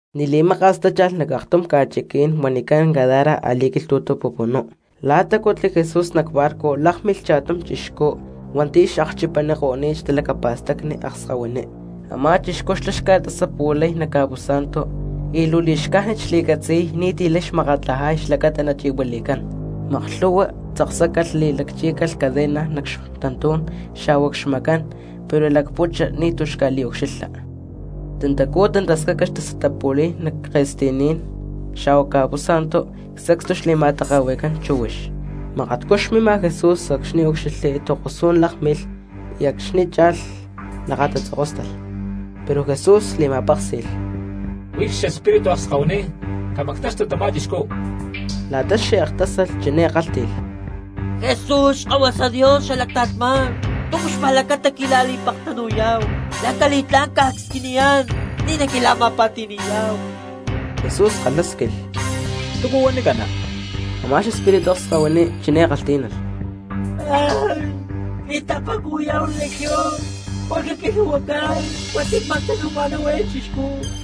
Ni̠ xli̠maka̠s tácha̠lh nac aktum ca̠chiquí̠n huanicán Gadara a̠li̠quilhtu̠tu pupunú. Lá tacutli Jesús nac barco lákmilh cha̠tum chixcú hua̠nti̠ xakchipaniko̠ni̠t xtalacapa̠stacni akskahuiní. Amá chixcú xlá xca̠tasapu̠lay nac ca̠pú̠sa̠ntu y luu li̠xcájnit xli̠catzi̠y ni̠ti̠ lay xmakatlajay xlacata nachi̠huili̠cán. Maklhu̠hua tzaksácalh li̠lacchí̠calh cadena nac xtantú̠n xa̠hua cxmacán pero xlacputxa y ni̠tu̠ xca̠liucxilha. Tantacú tantascaca xtasatapu̠li̠y nac ca̠ke̠sti̠ní̠n xa̠hua ca̠pú̠sa̠ntu, y sacstu xli̠ma̠take̠hui̠cán chíhuix. Makatcú xmima Jesús acxni̠ úcxilhli, tokosú̠n lákmilh y acxni̠ cha̠lh nícu xuí lakatatzokóstalh. Pero Jesús li̠ma̠péksi̠lh: —Huix xespíritu akskahuiní, camactaxtu tamá chixcú. La̠ta xe̠k tásalh chiné kálhti̠lh: —Jesús Xkahuasa Dios xala ta̠lhmá̠n, ¿túcu xpa̠lacata quila̠li̠pektanu̠yá̠hu? Lanca li̠tlá̠n cca̠squiniyá̠n ni̠ naquila̠ma̠pa̠ti̠ni̠yá̠hu. Jesús kalhásquilh: —¿Túcu huanicana? Amá xespíritu akskahuiní chiné kalhtí̠nalh: —Cli̠tapa̠cuhui̠yá̠hu Legión porque quilhu̠huacán hua̠nti̠ cmactanu̠ma̠náhu eé chixcú.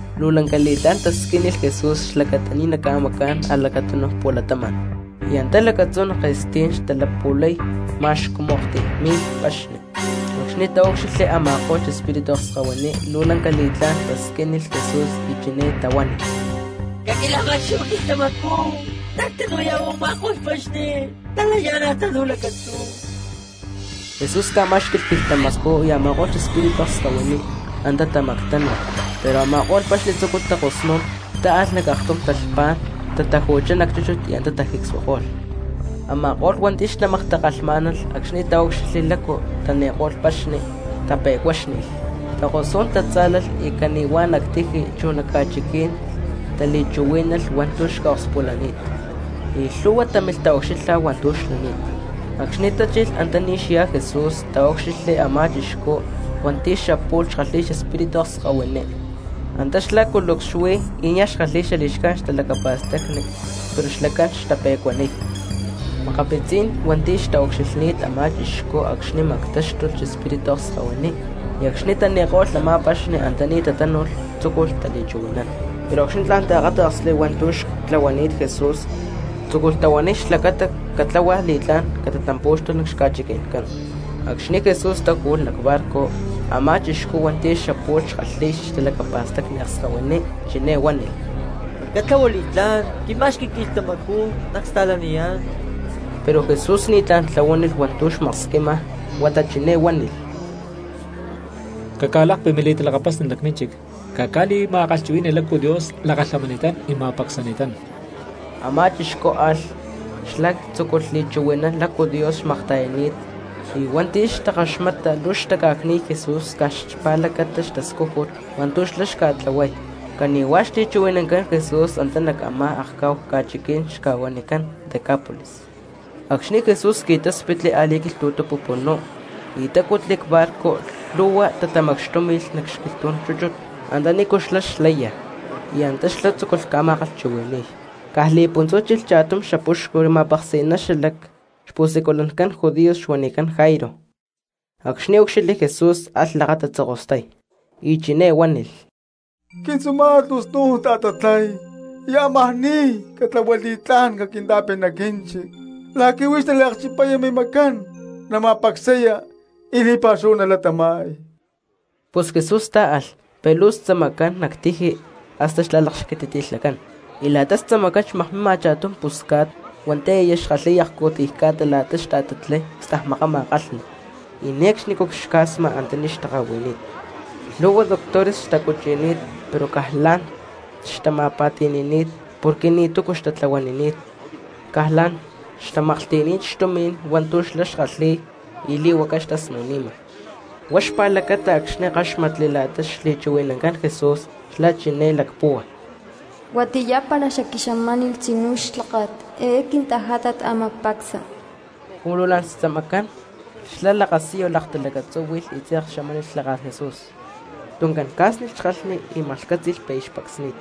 Luu lanca li̠tlá̠n tasquínilh Jesús xlacata ni̠ naca̠macá̠n a̠lacatunu pu̠latama̠n. Y antá lacatzú nac ke̠stí̠n xtalapu̠lay ma̠x cumu aktiy mi̠lh paxni, acxni̠ taúcxilhli a̠ma̠ko̠lh xespíritu akskahuiní luu lanca li̠tlá̠n tasquínilh Jesús y chiné tahuánilh: —Caquila̠ma̠xquí̠hu quilhtamacú nactanu̠yá̠hu nac a̠ma̠ko̠lh paxni talayá̠nalh tanú lacatzú. Jesús ca̠má̠xqui̠lh quilhtamacú, y a̠ma̠ko̠lh xespíritu akskahuiní antá tamactánu̠lh. Pero a̠ma̠ko̠lh paxni tzúculh takosnún, táalh nac aktum talhpá̠n, tataju̠chá nac chúchut y antá tajicsuako̠lh. Ama̠ko̠lh hua̠nti̠ xtamaktakalhmá̠nalh paxni acxni̠ taúcxilhli lácu tani̠ko̠lh paxni, tape̠cuáxni̠lh, takosú̠n tatzá̠lalh y cani̠huá nac tiji chu nac ca̠chiquí̠n tali̠chuhuí̠nalh hua̠ntu̠ xca̠okspulani̠t, y lhúhua cristianos támilh taucxilha hua̠ntu̠ xlani̠t. Acxni̠ tachilh antaní xyá Jesús, taúcxilhli a̠má chixcú hua̠nti̠ xapu̠lh xkalhi̠y xespíritu akskahuiní, antá xlá culucs xuí y niaj xkalhi̠y li̠xcájnit xtalacapa̠stacni. Pero xlacán xtape̠cuaniy. Makapitzí̠n cristianos hua̠nti̠ xtaucxilhni̠t a̠má chixcú acxni̠ tamactáxtulh xespíritu akskahuiní y acxni̠ tani̠ko̠lh a̠má paxni antaní tatánu̠lh, tzúculh tali̠chuhui̠nán. Pero acxni̠ tla̠n taakáta̠ksli hua̠ntu̠ xtlahuani̠t Jesús tzúculh tahuaniy xlacata catláhualh li̠tlá̠n catatampú̠xtulh nac xca̠chiqui̠ncán. Acxni̠ Jesús táju̠lh nac barco, a̠má chixcú hua̠nti̠ xapu̠lh xkalhi̠y xtalacapa̠stacni akskahuiní chiné huánilh: —Catlahua li̠tlá̠n, quima̠xqui quilhtamacú nacsta̠laniyá̠n. Pero Jesús ni̠ tla̠n tlahuánilh hua̠ntu̠ xmaksquima huata chiné huánilh: —Caca̠lakpi mili̠talakapasni nac mínchic, caca̠li̠ma̠kalhchuhui̠ni lácu Dios lakalhamani̠tán y ma̠pacsani̠tán. Amá chixcú alh, xlá tzúculh li̠chuhui̠nán lácu Dios xmakta̠yani̠t, y hua̠nti̠ xtakaxmata luu xtaca̠cni̠y Jesús caj xpa̠lacata xtascújut hua̠ntu̠ xlá xca̠tlahuay, cani̠huá xli̠chuhui̠nancán Jesús antá nac a̠má akcá̠hu ca̠chiquí̠n xca̠huanicán Decápolis. Acxni̠ Jesús qui̠táspitli a̠li̠quilhtu̠tu pupunú y tacutli cbarco lhu̠hua cristianos tatamacxtúmi̠lh nac xquilhtú̠n chúchut antanícu xlá xlaya, y antá xlá tzúculh ca̠ma̠kalhchuhui̠ni̠y. Caj li̠puntzú chilh cha̠tum xapuxcu ma̠peksi̠ná xalac xpu̠siculancán judíos xuanicán Jairo. Acxni̠ úcxilhli Jesús alh lakatatzokostay, y chiné huánilh: —Quintzuma̠t luu snu̠n ta̠tatlay y amajá ni̠y, catlahua li̠tlá̠n caquinta̠pi nac quínchic la̠qui̠ huix naliacchipaya mimacán, nama̠pacsaya y li̠pa̠xúhu nalatama̠y. Pus Jesús tá̠alh pero luu xtzamacán nac tiji hasta xla̠lakxquititi̠lhacán. Y nac xlaksti̠pá̠n cristianos xmakmima cha̠tum pusca̠t hua̠nti̠ aya xkalhi̠y akcu̠tiy ca̠ta la̠ta xta̠tatlay cstajmakama kalhni y ne̠cxni cxuncniy antaní xtaka̠hui̠ni̠t. Y lhu̠hua doctores xtacuchi̠ni̠t pero caj la̠n xtama̠pa̠ti̠ni̠ni̠t porque ni̠tu̠cu xtatlahuanini̠t, caj la̠n xtamaklhti̠ni̠t xtumi̠n hua̠ntu̠ xlá xkalhi̠y y li̠huaca xtasnu̠ni̠ma. Huá xpa̠lacata acxni̠ káxmatli la̠ta xli̠chuhui̠nancán Jesús xlá chiné lacpúhua: “Huatiyá para xacqui̠xamánilh tzinú clháka̠t eé quintajátat ámaj pacsa.” Cumu luu xtzamacán xlá lakasiyu laktalakatzúhui̠lh y tze̠k xamánilh clháka̠t Jesús. Tuncán tachókolh xkalhni y maklhcátzi̠lh pi̠ aya xpacsni̠t.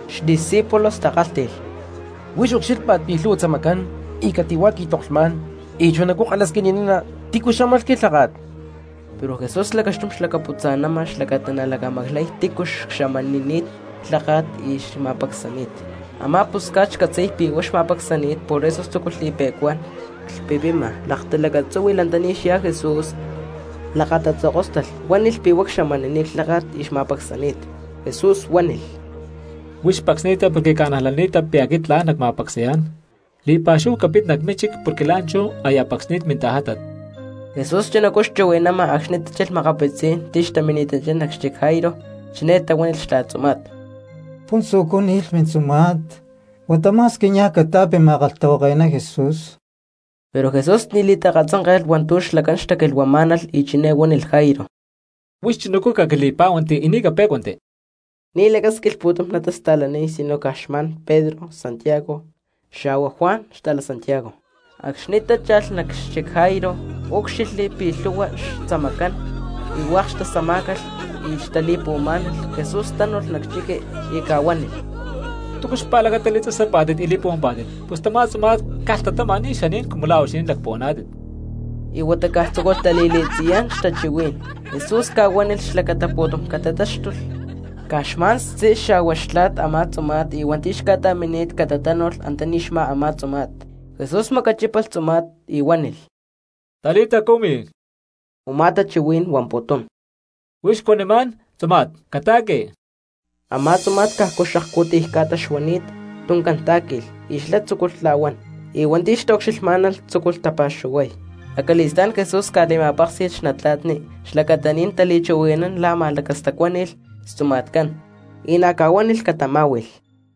Xdiscípulos takálhti̠lh: —Huix ucxílhpa̠t pi̠ lhu̠hua tzamacán y cati̠huá qui̠toklhmá̠n, todavía kalhasquini̠nana: “¿Tícu xámalh quilháka̠t?” Pero Jesús lacaxtum xlacaputza̠nama xlacata nalacamaclay tícu cxamanini̠t clháka̠t y xma̠pacsani̠t. Amá pusca̠t xcatzi̠y pi̠ huá xma̠pacsacani̠t por eso tzúculh li̠pe̠cuán, clhpipima talacatzúhui̠lh antaní xyá Jesús, talakatatzokóstalh nac xlacatí̠n, huánilh pi̠ huá cxamanini̠t clháka̠t y xma̠pacsani̠t. Jesús huánilh: —Huix pacsni̠ta porque ca̠najlani̠ta pi̠ aquit tla̠n nacma̠pacsayá̠n, li̠pa̠xúhu capit nac mínchic porque la̠nchú aya pacsni̠t mintajátat. Jesús chunacú xchuhui̠nama acxni̠ tachilh makapitzí̠n cristianos xlacán taminchá nac xchic Jairo. Chiné tahuánilh xtla̠t a̠má tzuma̠t: —Puntzujcú ni̠lh mintzuma̠t, huata ma̠squi niaj cata̠pi ma̠kalhtahuake̠ná Jesús. Pero Jesús ni̠ li̠ta̠katzánke̠lh hua̠ntu̠ xlacán xtaquilhuamá̠nalh y chiné huánilh Jairo: —Huix chunacú caquili̠pá̠huanti y ni̠ capé̠cuanti. Ni̠ lacásquilh pu̠tum natasta̠laniy sino caj xma̠n Pedro, Santiago xa̠hua Juan xta̠Santiago. Acxni̠ tácha̠lh nac xchic Jairo, úcxilhli pi̠ lhu̠hua xtzamacán y hua̠k xtasama̠kó̠calh y xtali̠puhuamá̠nalh. Jesús tánu̠lh nac chiqui y ca̠huánilh: —¿Túcu xpa̠lacata li̠tasapá̠tit y li̠puhuampá̠tit? Pus tamá tzuma̠t caj lhtatama, ni̠ xaní̠n cumu la̠ huixinín lacpuhuaná̠tit. Y huata caj tzúculh tali̠li̠tziyán xtachuhuí̠n. Jesús ca̠huánilh xlacata pu̠tum catatáxtulh, caj xma̠n xtzí xa̠hua xtla̠t a̠má tzuma̠t y hua̠nti̠ xca̠ta̠mini̠t ca̠ta̠tánu̠lh antaní xmá a̠má tzuma̠t. Jesús macachípalh a̠má tzuma̠t y huánilh: —Talita cumi —u̠má tachuhuí̠n huamputún: Huix cuanimá̠n, tzuma̠t, cata̠qui. Y a̠má tzuma̠t cajcu xakcu̠tiy ca̠ta xuani̠t, tuncán tá̠qui̠lh y xlá tzúculh tla̠huán. Y hua̠nti̠ xtaucxilhmá̠nalh cristianos tzúculh tapa̠xuhuay. Acali̠stá̠n Jesús ca̠li̠ma̠péksi̠lh xnatla̠tni xlacata ni̠ natali̠chuhui̠nán la̠ ma̠lacastacuáni̠lh xtzuma̠tcán y na̠ ca̠huánilh catamá̠hui̠lh.